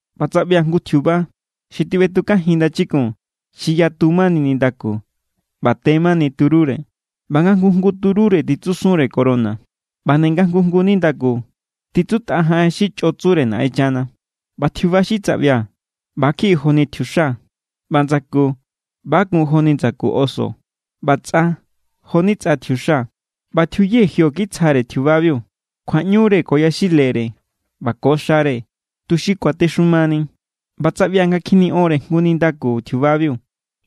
ꞌBa tsaꞌbia̱ jngu tjiuba xi tiꞌbetukajin ndachikun xi yatu mani nindaku ꞌba te mani turúre. ꞌBa nga jngu jngu turúre titsusunre corona. ꞌBa nde nga jngu jngu nindaku tjitsutꞌa jaꞌen xi chꞌo tsure Naꞌenchana. ꞌBa tjiuba xi tsaꞌbia̱ ꞌba= kjiꞌi joni tjiuxa. ꞌBa ndsaku ꞌba= kun jo=ni ndsaku oso, ꞌba tsꞌa jo=ni tsꞌa tjiuxa. ꞌBa tjiuye jio kitsjare tjiubabiu kjuaꞌñure ko yaxilere ꞌba ko xare, tuxi kuatexumani. ꞌBa tsaꞌbia̱ nga kjiniꞌonre jngu nindaku tjiubabiu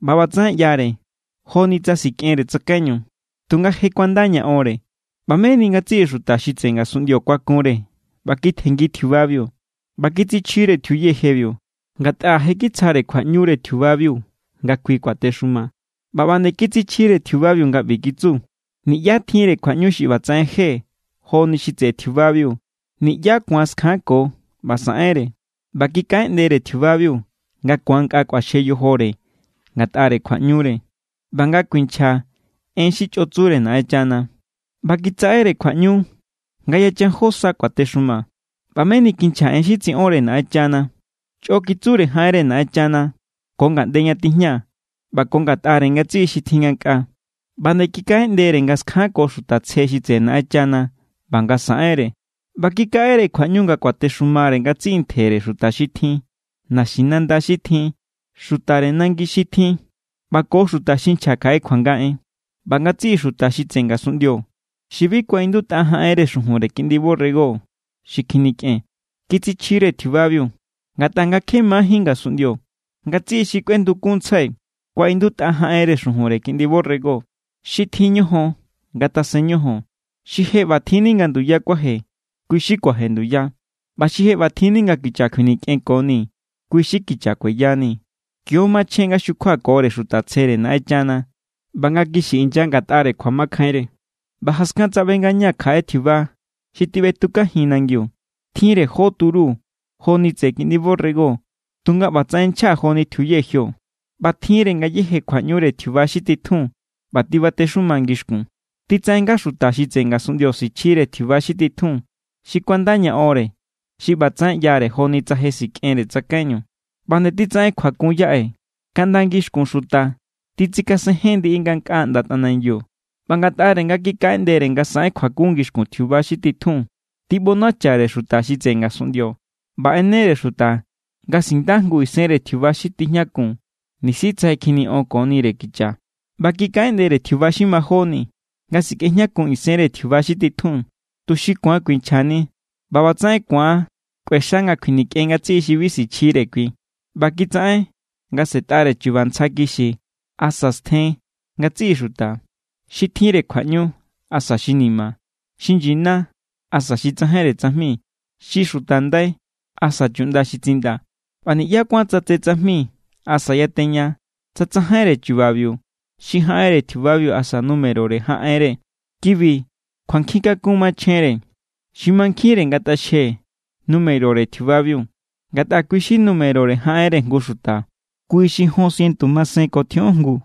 ꞌba ꞌbatsaꞌen ꞌyare joni tsa sikꞌenre tsakaiñu, tunga je kuanda ña onre. ꞌBa meni ngatsiꞌi xuta xi tseꞌe ngasunꞌndio kuakunre ꞌba kitjenngi tjiubabiu. ꞌBa kitsichjire tjiuye jebiu, ngatꞌa je kitsjare kjuaꞌñure tjiubabiu nga kui kuatexuma. ꞌBa ꞌba nde kitsichjire tjiubabiu nga ꞌbi kitsu: “Niꞌyá tjinre kjuaꞌñu xi ꞌbatsaꞌen je joni xi tseꞌe tjiubabiu. Niꞌyá ku̱an skjanko ꞌba saꞌenre.” ꞌBa kikaꞌeꞌndere tjiubabiu nga ku̱an nkꞌa kꞌuaxje yojore ngatꞌare kjuaꞌñure ꞌba nga kuinchja en xi chꞌo tsure Naꞌenchana. ꞌBa kitsaꞌere kjuaꞌñu nga yachan jó sa kuatexuma. ꞌBa meni kinchja en xi tsiꞌonre Naꞌenchana. Chꞌo kitsure jaꞌenre Naꞌenchana ko ngaꞌnde ña tijña ꞌba ko ngatꞌare ngatsiꞌi xi tjin ngankꞌaa. ꞌBa nde kikaꞌeꞌndere nga skjanko xuta tsje xi tseꞌe Naꞌenchana ꞌba nga saꞌenre. ꞌBa kikaꞌere kjuaꞌñu nga kuatexumare ngatsiꞌi ntjere xuta xi tjin, naxinanda xi tjin, xutare nangi xi tjin ꞌba ko xuta xi nchja kjaꞌe kjuanga en. ꞌBa ngatsiꞌi xuta xi tseꞌe ngasunꞌndio, xi bi kuaꞌindutꞌa jaꞌenre xujunre Kiꞌndi borrego xi kjinikꞌen, kitsichjire tjiubabiu. Ngatꞌa nga kje majín ngasunꞌndio, ngatsiꞌi xi kꞌuendukunntsjai kuaꞌindutꞌa jaꞌenre xujunre Kiꞌndi borrego. Xi tjin ñojon ngatasen ñojon. Xi je ꞌbatjinni nga nduya kuaje, kui= xi kuaje nduya. ꞌBa xi je ꞌbatjinni nga kicha kjuinikꞌenkoni, kui= xi kicha kueya=ni. Kio= machjen nga xukjuakore xuta tsjere Naꞌenchana ꞌba nga kixi inya ngatꞌare kjuamakjainre. ꞌBa jaskan tsaꞌbe ngañaa̱ kjaꞌe tjiuba xi tiꞌbetukanijin nangiu. Tjinre jó turu joni tseꞌe kiꞌndi borrego, tunga ꞌbatsaꞌen nchja joni tjiuye jio. ꞌBa tjinre ngayéje kjuaꞌñure tjiuba xi titjun ꞌba tibatexuma ngixkun. Titsaꞌen nga xuta xi tseꞌe ngasunꞌndio sichjire tjiuba xi titjun, xi kuanda ña onre xi ꞌbatsaꞌen ꞌyare joni tsa sikꞌenre tsakaiñu. ꞌBa nde titsaꞌen kjuakun yaꞌe, kaꞌnda ngixkun xuta titsikasenjen ndiꞌi ngankꞌaa ꞌnda tꞌanangiu. ꞌBa ngatꞌare nga kikaꞌeꞌndere nga saꞌen kjuakun ngixkun tjiuba xi titjun, tiꞌbonachare xuta xi tseꞌe ngasunꞌndio. ꞌBa ꞌenere xuta nga sinda jngu isenre tjiuba xi tijñakun nisi tsa je kjiniꞌonkonire kicha. ꞌBa kikaꞌeꞌndere tjiuba xi majóni nga sikꞌejñakun isenre tjiuba xi titjun, tuxi ku̱an kuinchjani ꞌba ꞌbatsaꞌen ku̱an kꞌuexa nga kjuinikꞌen ngatsiꞌi xi bi sichjire kui. ꞌBa kitsaꞌen nga sꞌe̱tꞌare chu̱ba̱ ntsja kixi asa stjen ngatsiꞌi xuta, xi tjinre kjuaꞌñu asa xi ni̱ma̱, xi nyina asa xi tsajainre tsajmi, xi xuta ndai asa chuꞌnda xi tsindaa̱. ꞌBa niꞌyá kuán tsatse tsajmi asa yateña tsa tsajainre chubabiu, xi jaꞌenre tjiubabiu asa numerore jaꞌenre. Kibi kjuankjin kakun machjenre. Xi mankjinre ngatꞌaxje numerore tjiubabiu, ngatꞌa kui= xi numerore jaꞌenre jngu xuta. Kui= xi jon sientu masen ko tjioꞌon jngu.